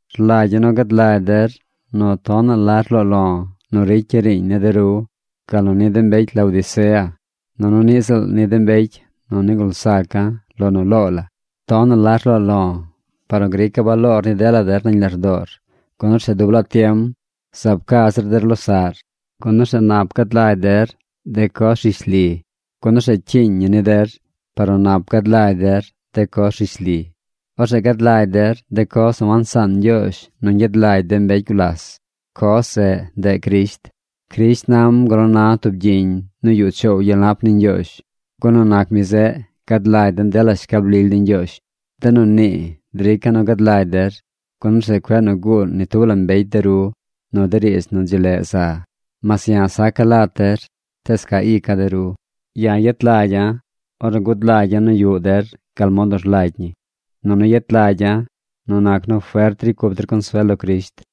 Rlagya̱ nu gad lagy der nu tonaꞌ la rloo lo̱ nu ricya̱ riiñ ni de ru, gal nu ni de mbecy Laodicea, nunu niꞌ ziꞌl ni de mbecy nu nigul zaca̱ lo nu loo la. Tonaꞌ la rloo lo̱ par nu grica̱ baloor ni dela der nañ lardoor, gun orzeꞌ dub laa tiem zaab ca zir der losaꞌr, gun orzeꞌ nap gad lagy der de coz rishli. Gun orzeꞌ cyiiñ ñi ni der par nu nap gad lagy der de coz rishli. Orzeꞌ gad lagy der de coz nu wansaan Ñgyoozh nu ñgyad lagy de mbecy gulas. Coz zeꞌ, ndeꞌ Crisht. Crisht nam gal nu na tub gyiñ nu yuꞌ choow gyel nap ni Ñgyoozh, gun nu nac mi zeꞌ gad lagy den dela shcab lily ni Ñgyoozh. De nu nii drica̱ nu gad lagy der, gun orzeꞌ cueꞌ nu guu ni tub la mbecy de ru nu de riidz nu dzi leꞌ za. Mas ya̱ saca̱ lat der, tees ca ica̱ de ru. Ya̱ yet lagya̱ ornu gud lagya̱ nu yuꞌ der gal mod nu rlagy ñi, nunu yet lagya̱ nu nac nu fert ricy cup der consuel lo Crisht.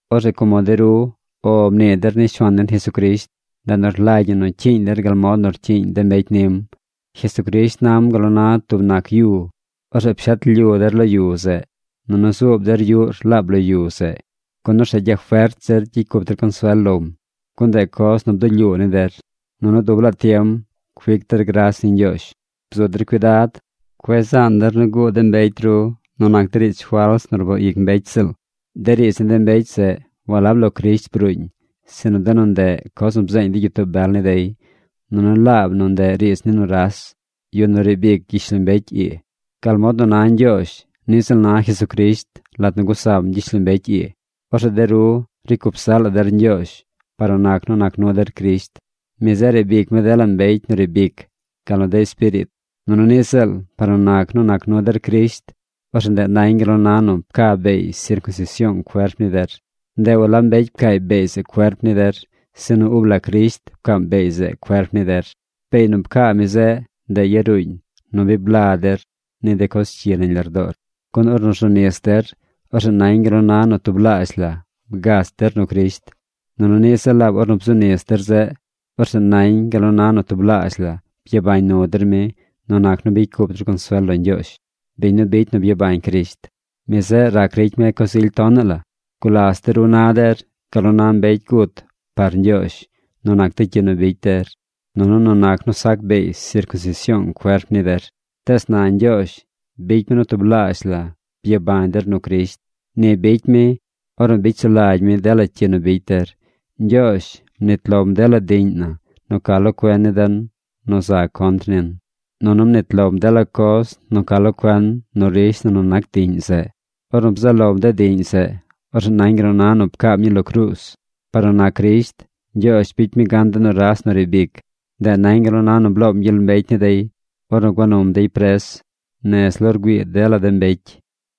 Orzeꞌ como de ru “O” mnii der ni Shuaan den Jesucrisht, ndeꞌ nu rlagy ñi nu cyiiñ der gal mod nu rcyiiñ de mbecy nim. Jesucrisht nam gal nu na tub nac yu. Orzeꞌ pshet lyu der lo yu zeꞌ, nunu zuub der yuꞌr laab lo yu zeꞌ, gun orzeꞌ gyafert zir gyicy cup der consuel lom, gun ndeꞌ coz nu bdulyuu ni der. Nunu dub laa tiem cuic der gras ni Ñgyoozh. Bzu der cuidad. Cueꞌ zaan der nu guu de mbecy ru nu nac de riidz fals nu rboo ic mbecy ziꞌl. De riidz ni de mbecy zeꞌ walab lo Crisht bruuñ, sinu de nu ndeꞌ coz nu bzeeñ de gyitoo bel ni dey, nunu laab nu ndeꞌ riidz ni nuras, yu nu riib ic gyishlombecy ii. Gal mod nu na Ñgyoozh, niꞌ ziꞌl na Jesucrisht lat nu gusam gyishlombecy ii. Orzeꞌ de ru ricy cup zaꞌ la der Ñgyoozh, par nu nac nu nac nu der Crisht. Mi zeꞌ riib ic mi dela mbecy nu riib ic, gal nu de espiriit. Nunu niꞌ ziꞌl par nu nac nu nac nu der Crisht, orzeꞌ ndeꞌ nañ gal nu na nu pca beey sircunsision cuerp ni der. Ndeꞌ walab mbecy pcaay beey zeꞌ cuerp ni der, sinu ub la Crisht pcaam beey zeꞌ cuerp ni der. Beey nu pcaa mi zeꞌ, ndeꞌ yaruuñ nu bi bla der ni de coz cyi nañ lardoor. Gun ornu rzu nis der, orzeꞌ nañ gal nu na nu tublaazh la bgach der nu Crisht. Nunu niꞌ ziꞌl laab ornu bzu nis der zeꞌ, orzeꞌ nañ gal nu na nu tublaazh la byabañ nu der mi nu nac nu bicy cup der consuel lo Ñgyoozh, biñ nu bicy nu byabañ Crisht. Mi zeꞌ rac ricy mi coz ily tonaꞌ la. Gulas de ru na der gal nu na mbecy gut par Ñgyoozh nu nac de cyi nu bicy der, nunu nu nac nu sac beey sircunsision cuerp ni der. Tees na Ñgyoozh bicy mi nu tublaazh la byabañ der nu Crisht. Ni bicy mi ornu bicy sulagy mi dela cyi nu bicy der. Ñgyoozh mnit lom dela diꞌñ na nu ca lo cuen ni den nu za contr nin, nunu mnit lom dela coz nu ca lo cuen nu rish na nu nac diꞌñ zeꞌ. Ornu bzaꞌ lom de diꞌñ zeꞌ, orzeꞌ nañ gal nu na nu pcaam ñii lo cruuz. Par nu nac Crisht, Ñgyoozh bicy mi gan de nuras nu riib ic. Ndeꞌ nañ gal nu na nu bloom gyel mbecy ni dey ornu gua num dey pres nez lo rgüii dela de mbecy.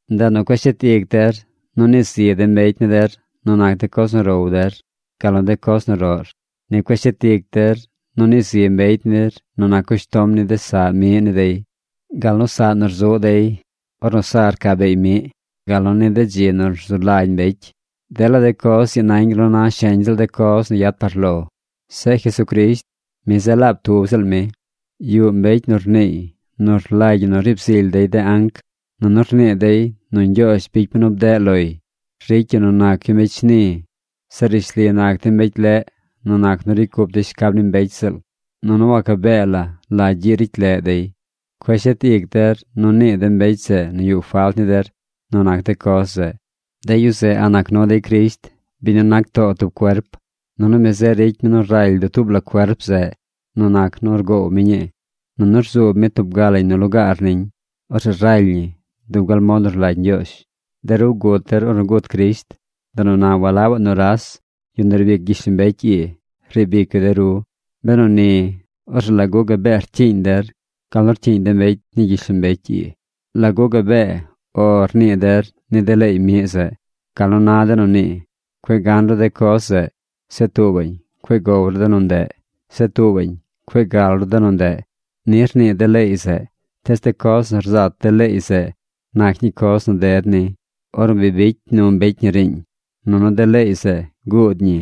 Ndeꞌ nu cueꞌ shet ic der nu nii zi de mbecy ni der nu nac de coz nu row der, gal nu de coz nu roꞌr. Ni cueꞌ shet ic der nu nii zi mbecy nir nu nac cushtom ni de saꞌ miꞌ ni dey, gal nu saꞌ nu rzuꞌ dey ornu sa rca beey miꞌ, gal nu ni de dzi nu rzu lagy mbecy. Dela de coz ii nañ gal nu na sheñ ziꞌl de coz nu yad par lo. Zeꞌ Jesucrisht, mi zeꞌ laab tub ziꞌl mi. Yuꞌ mbecy nu rniiy nu rlagy ñi nu riib zily dey de anc. Nunu rnii dey nu Ñgyoozh bicy mi nu bdeꞌ loy. Ricy yu nu nac yu mbecy shni. Zeꞌ rishli nac dey mbecy leꞌ nu nac nu ricy cup dey shcab ni mbecy ziꞌl. Nunu waca bee la la gyiꞌ ricy leꞌ dey. Cueꞌ shet ic der nu nii de mbecy zeꞌ nu yuꞌ falt ni der nu nac de coz zeꞌ. De yu zeꞌ a̱ꞌ nac nu dey Crisht, biñ nu nac too tub cuerp. Nunu mi zeꞌ ricy mi nu raly dutuub la cuerp zeꞌ nu nac nu rgoow mi ñii, nunu rzuub mi tub ga lañ nu lugaar niñ. Orzeꞌ raly ñi dub gal mod nu rlagy Ñgyoozh. De ru gut der ornu gut Crisht. Ndeꞌ nu na walabaꞌ nuras, yu nu riib ic gyishlombecy ii, riib ic yu de ru. Benu ni, orzeꞌ ¿lagu gabee rcyiiñ der gal nu rcyiiñ de mbecy ni gyishlombecy ii? ¿Lagu gabee “O” rnii der ni de leey miꞌ zeꞌ? Gal nu na de nu nii: Cueꞌ gan ru de coz zeꞌ. Zeꞌ tuubaꞌñ: Cueꞌ gow ru de nu ndeꞌ. Zeꞌ tuubaꞌñ: Cueꞌ gal ru de nu ndeꞌ. Ni rnii de leey zeꞌ. Tees de coz nu rzat de leey zeꞌ nac ñii coz nu ded ni, ornu bi bicy nu mbecy ñii riiñ. Nunu de leey zeꞌ guud ñi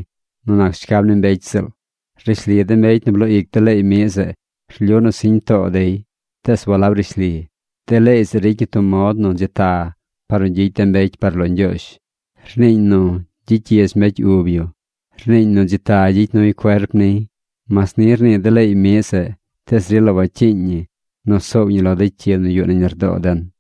nu nac shcab ni mbecy ziꞌl. Rishli de mbecy nu bloo ic de leey miꞌ zeꞌ, rlyu nu siñ too dey, tees walab rishli. De leey zeꞌ ricy ñi tub mod nu dzi ta par nu gyicy de mbecy par lo Ñgyoozh. Rniiñ nu gyicy gyidz mbecy ub yu. Rniiñ nu dzi ta gyicy nuy cuerp niy. Mas ni rnii de leey miꞌ zeꞌ, tees rila wacyiiñ ñi nu soow ñi lo de cyi nu yuꞌ nañ lardoo den.